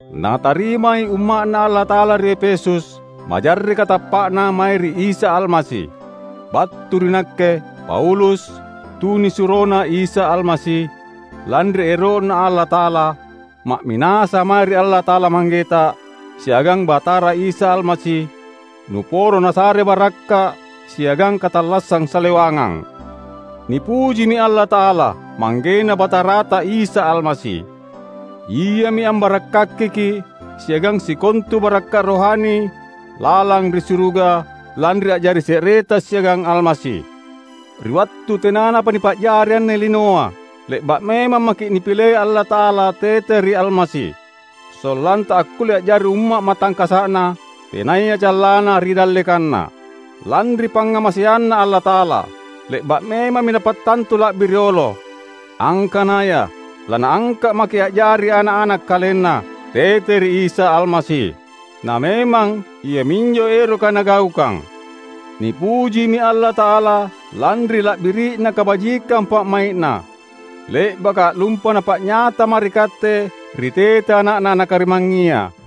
Natarimai umma’Na Allata’ala ri Efesus, majarreka tappa’na mae ri Isa Almasi. Battu ri nakke, Paulus, tunisuroNa Isa Almasi, lanri ero’Na Allata’ala; ma’minasa’ mae ri Allata’ala Manggeta, siagang Batara Isa Almasi, nuporo Nasare barakka’ siagang katallassang salewangang. Nipujimi Allata’ala, ManggeNa Batarata Isa Almasi. Iami ambarakkakiki’ siagang sikontu barakka’ rohani lalang ri suruga, lanri a’jari se’reta siagang Almasi. Ri wattu tenanapa nipa’jari anne linoa, le’ba’ memang maki’ Napilei Allata’ala tete ri Almasi; sollanta akkulle a’jari umma’ matangkasa’Na, tenaya callanna ri dallekanNa. Lanri pangngamaseanNa Allata’ala, le’ba’ memammi Napattantu la’bi riolo, angkanaya laNaangka’ maki’ a’jari ana’-ana’ KalenNa, tete ri Isa Almasi. Na memang iaminjo eroka Nagaukang. Nipujimi Allata’ala lanri la’biri’na kabajikang pa’mai’Na, le’baka allumpa Napa’nyata mae ri katte ri tete Ana’Na Nakarimangngia.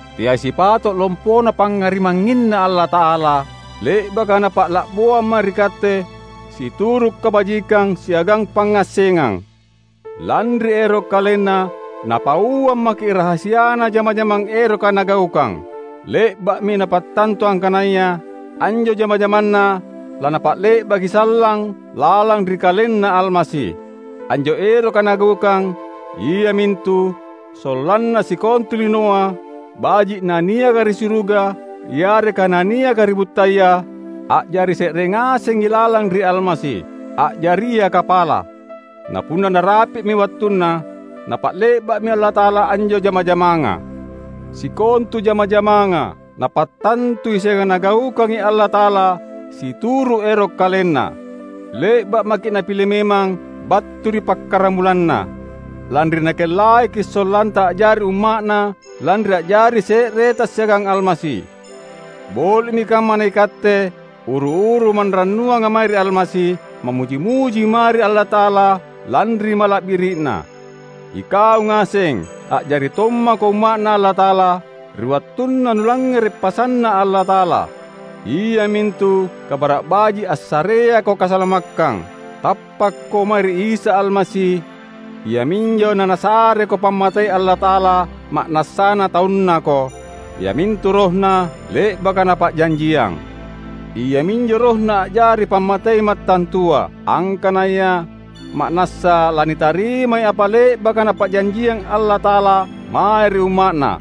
Teai sipato’ lompona pangngarimangnginNa Allata’ala, le’baka Napa’laboang mae ri katte situru’ kabajikang siagang pangngassengang. Lanri ero’ KalenNa, Napauang maki’ rahasiana jama-jamang eroka Nagaukang; le’ba’mi Napattantu angkanaya anjo jama-jamanNa laNapa’le’baki sallang lalang ri KalenNa Almasi. Anjo eroka Nagaukang, iamintu, sollanna sikontu linoa, baji’ na niaka ri suruga yareka na niaka ri buttaya, a’jari se’re ngasengi lalang ri Almasi, a’jaria kapala. Na punna narapi’mi wattunna, laNapa’le’ba’mi Allata’ala anjo jama-jamanga. Sikontu jama-jamanga, Napattantui siagang Nagaukangi Allata’ala situru’ ero’ KalenNa. Le’ba’ maki’ Napile memang battu ri pakkaramulanna, lanri Nakellaiki’ sollanta a’jari umma’Na lanri a’jari se’reta siagang Almasi. Boli’mi kamma naikatte, uru-uru manrannuanga mae ri Almasi, mammuji-muji mae ri Allata’ala lanri mala’biri’Na! Ikau ngaseng, a’jari tommako umma’Na Allata’ala ri wattunna nulangngere’ pasanNa Allata’ala, iamintu Kabara’ Baji’ assareako kasalamakkang. Tappakko mae ri Isa Almasi iaminjo naNasareko pammatei Allata’ala ma’nassana taunNako, iamintu RohNa, le’baka Napa’janjiang. Iaminjo RohNa a’jari pammatei mattantua, angkanaya ma’nassa lanitarimai apa le’baka Napa’janjiang Allata’ala mae ri umma’Na.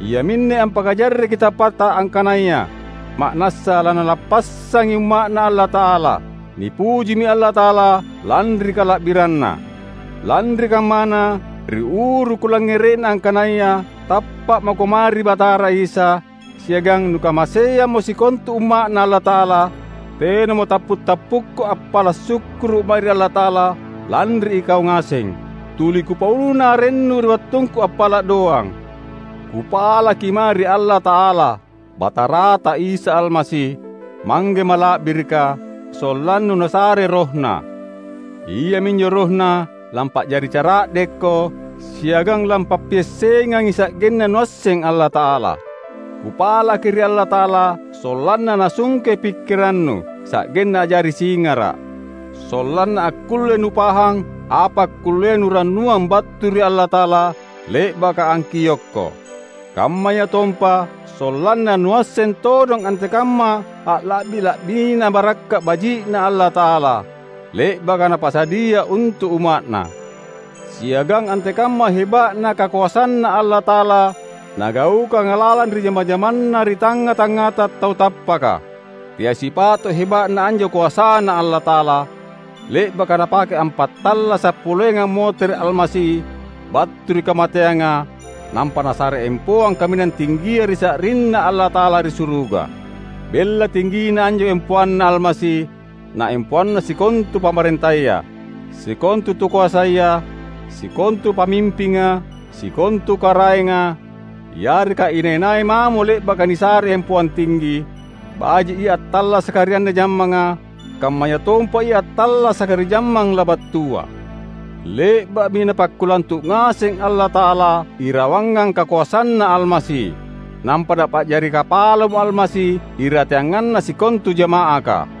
Iaminne ampakajarreki tappatta angkanaya ma’nassa laNalappassangi umma’Na Allata’ala. Nipujimi Allata’ala lanri kala’biranNa. Lanri kammana, ri uru kulangngere’na angkanaya tappa’ mako mae ri Batara Isa, siagang nukamaseammo sikontu Umma’Na Allata’ala, tenamo tappu’-tappukku appala’ sukkuru’ mae ri Allata’ala lanri ikau ngaseng. Tuli kupauna arennu ri wattungku appala’ doang. Kupalaki mae ri Allata’ala, Batarata Isa Almasi, Mangge mala’birika, sollannu Nasare RohNa. Iaminjo RohNa lampa’jari cara’dekko, siagang lampappiassengangi sa’genna nuasseng Allata’ala. Kupalaki ri Allata’ala sollanna Nasungke pikkirannu, sa’genna a’jari singara’; sollanna akkulle nupahang apa akkullea nurannuang battu ri Allata’ala, le’baka angkiokko. Kammayatompa sollanna nuasseng todong antekamma alla’bi-la’bina barakka’ baji’Na Allata’ala, le’baka Napasadia untu’ umma’Na; siagang antekamma heba’na kakoasanNa Allata’ala Nagaukanga lalang ri jama-jamanna ri tangnga-tangngata tau tappaka. Teai sipato’ heba’na anjo koasaNa Allata’ala, le’baka Napake ampattallasa’ poleangi ammotere’ Almasi battu ri kamateanga; nampa Nasare empoang kaminang tinggia ri sa’rinNa Allata’ala ri suruga. Bella tinggina anjo empoanNa Almasi na empoanna sikontu pamarentaya, sikontu tukoasaya, sikontu pamimpinga, sikontu karaenga, yareka inai-nai mamo le’baka nisare empoang tinggi; baji’ ia attallasaka ri anne jammanga, kammayatompa ia attallasaka ri jammang labattua. Le’ba’mi Napakkulantu’ ngaseng Allata’ala irawangang kakoasanNa Almasi; nampa Napa’jari Kapalamo Almasi irateanganna sikontu jama’aka.